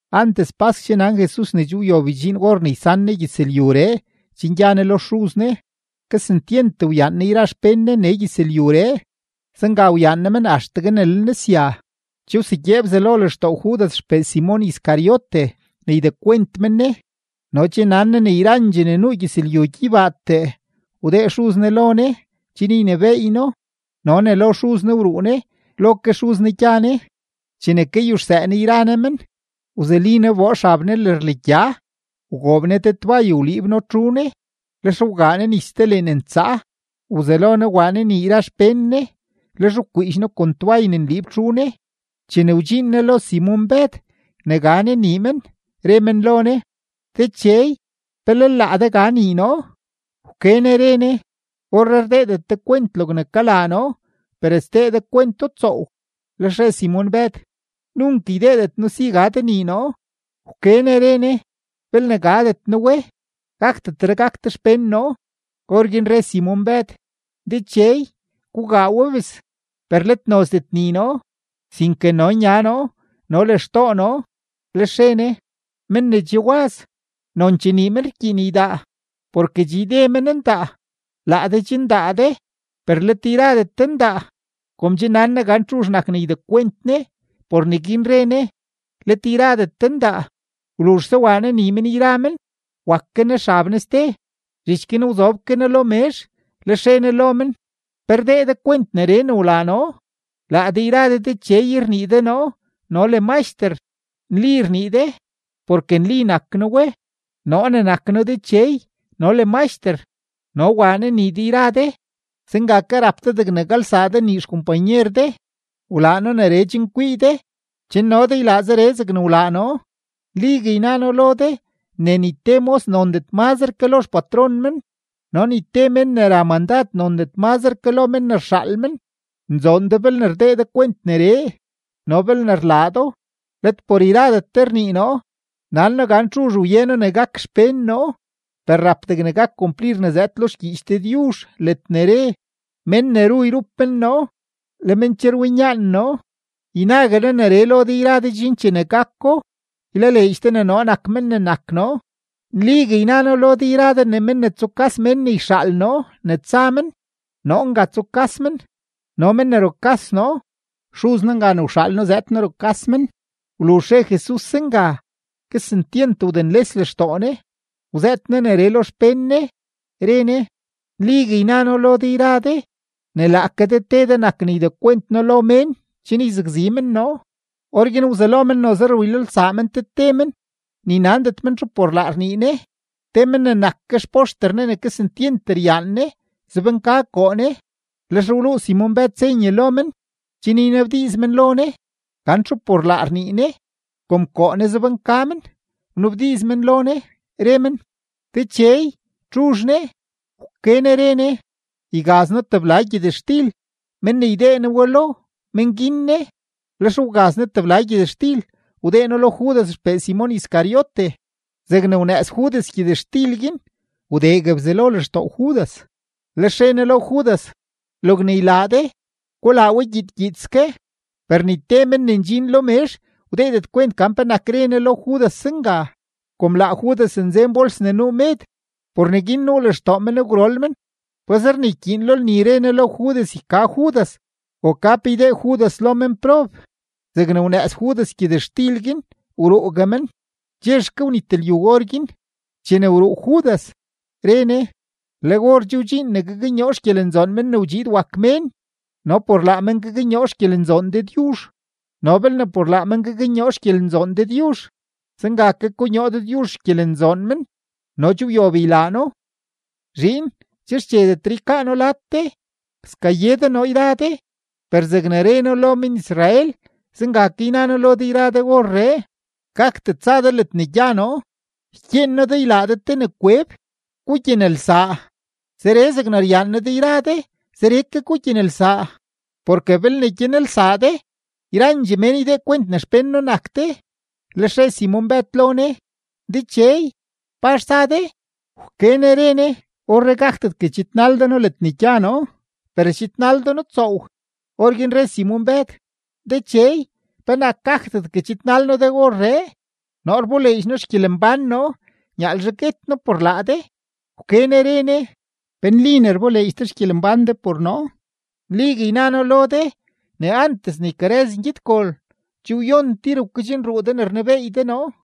Antes pask che nan Jesus ne che wyob ydxiin or ne ysan Ne gyëzlyuree chen gya Ne lo Xuz Ne. Kesentyent wyaan Ne yra xpén Ne nee gyëzlyuree, zenga wyaan Ne men axtegue ne le Ne sya. Che wsegyee Bzelo lextoo Judas xpee Simon Iscariote ne ydekwent men Ne, no che nan Ne ne yrandxee ne nuu gyëzlyu gyeybaatee wdee Xuz Ne lo Ne chen ynebééy No no ne lo Xuz Ne wruu Ne, lo ke Xuz Ne gya Ne. Chene kayuxsëë Ne yra Ne men, wzuli Ne wboo xab Ne lërlegya, wgoob Ne te toay wliib No txu Ne. Lex wgaa Ne nis te leen ntsaa, wzelo Ne waa Ne nii yra xpén Ne, lex wkwiidx No kon toay ne nliib txu Ne. Chene wdxiin Ne lo Simon-Bëd ne ga Ne nii men, re men lo Ne: ―Dechey, ¿pe lel laa de ga nii noo? Wke Ne re Ne: ―Orree rdeedet de kwent logne kalaa noo, per sdee de kwento tsoow. Lex re Simon-Bëd: ―Nunk ydeedet noo si ga de nii noo. Wke Ne re Ne: ―Belne gadet noo we, gakdetre gak de xpén noo. Orguin re Simon-Bëd: ―Dechey, gugaa we bes, per let nozdet nii noo, sinke no nya noo no le xtoo noo. Lex re Ne: ―Men ne che waz, nonchee nii men rkyiin ydaa, porke che yde men ndaa. Laa de che ndaa de, per let yradet de ndaa. Kom che nan Ne gan txuzh nak ne ydekwent Ne, por neguin re Ne: “Let yradet de ndaa.” Wluzhse waa Ne nii men yra men, wak ke Ne xab Ne ste; zhich guin wzob ke Ne lo mezh, lex re Ne lo men: ―¿Pe rdee de kwent neree ne wlaa noo? Laa de yra de, Dechey rnii de noo no le Maxter; nli rnii de, porke nli nak noo we. Noo ne nak noo Dechey no le Maxter, no waa noo nii de yra de, zenga ke rap de degne galsaa de nii xkompanyer de. Wlaa noo neree chen kwii de chen no de ylaa zeree zegne wlaa noo. Nligue yna noo lo de ne ni te mos nondet mazre ke lo xpatron men, no ni te mén ne ra mandad nondet mazre ke lo mén ne rxaal men. Nzoon de belne rdee de kwent neree no belne rlaa do. ’Let por yradet de rnii noo; nan noo gan txuzh wye noo ne gak xpén noo. Per rap degne gak kumplir ne zëëd lo xgyiich Dëdyuzh ledne re: “Mén ne ru yrup men noo, le men che rwinyaan noo.” Ynague noo neree lo de yra de chen chene gako, ylaleedx de ne noo nak men ne nak noo. Nligue yna noo lo de ne men ne tsukas mén ne yxaal noo ne tsa men, noo nga tsukas men; no men ne rukas noo, Xuz noo nga ne wxaal noo zëëd noo rukas men. Wluzh re Jesus zenga, kesentyent wdenles lextoo Ne, wzëët Ne neree lo xpén Ne, re Ne: ―Nligue yna noo lo de yra de, ne laake de te de nak ne ydekwent noo lo mén chen yzakzi men noo. Orguin wzelo men noze rwilolsaa men te te men, ni nandet men txu por laa rnii Ne. Te men ne nak ke xpoxter Ne ne kesentyent ryaan Ne, zobnka koo Ne. Lex wluu Simon-Bëd senye lo men chen ynabdiiz men lo Ne gan txu por laa rnii Ne. Kom koo Ne zobnka men, wnabdiiz men lo Ne, re men: ―Dechey, ¿txuzh ne? Wke Ne re Ne: ―Ygaz noo tebla gyëtxtil; men ne ydee noo we lo, men guin ne. Lex wgaz Ne tebla gyëtxtil, wdee No lo Judas xpee Simon Iscariote. Zegne wnëëz Judas gyëtxtil guin, wdegue Bzelo lextoo Judas. Lex re Ne lo Judas: ―Logne ylaa de, gulaa we gyiid gyiidske. Per ni te men ne ndxin lo mezh wdeedet kwent gan penak re Ne lo Judas zenga. Kom laa Judas nzen bols ne nuu med, por neguin nuu lextoo men gwrol men pazer ne ykyiin lo lni re Ne lo Judas yka Judas o ka pe ydee Judas lo menprob. Zegne wnëëz Judas gyëtxtil guin, wruugue men. Chexke wnit lyu orguin. Chene che wruu Judas, re Jesus: ―Le or che wdxiin ne gaknyoo xgyelenzoon Men ne wdxiid wak Mén no por laa men gaknyoo xgyelenzoon Dëdyuzh. No belne por laa men gaknyoo xgyelenzoon Dëdyuzh, zenga ke konyoo Dëdyuzh xgyelenzoon men no che wyob ylaa No. Zhiin, che xchedetre ykaa noo lad de. Skaye de noo yra de, per zegne re noo lo men-Israel, zenga ke yna noo lo de yra de orree: Gakdet tsa de ledne gya noo. Ykyeen noo de ylaa de te ne kweb: Gugyanelsaa; zeree zegne ryaan noo de yra de, zeree ke gugyanelsaa. Porke belne gyanelsaa de, yrandxee mén ydee kwent ne xpén noo nak de. Lex re Simon-Bëd lo Jesus: ―Dechey, ¿pazh tsa de? Wke Ne re Ne: ―Orree gakdetgue chidnal de noo ledne gya noo, per schidnal de noo tsoow. Orguin re Simon-Bëd: ―Dechey, ¿penak gakdetgue chidnal noo de orree? Noo rboleedx noo xgyelembán noo nyaalzhe guet noo por laa de. Wke Ne re Ne: ―¿Pe nli ne rboleedx de xgyelembán de por noo? Nligue yna noo lo de ne antes ne ykarëz ngyedgol, che wyon tir wkedxnruu de ne rnebeey de noo.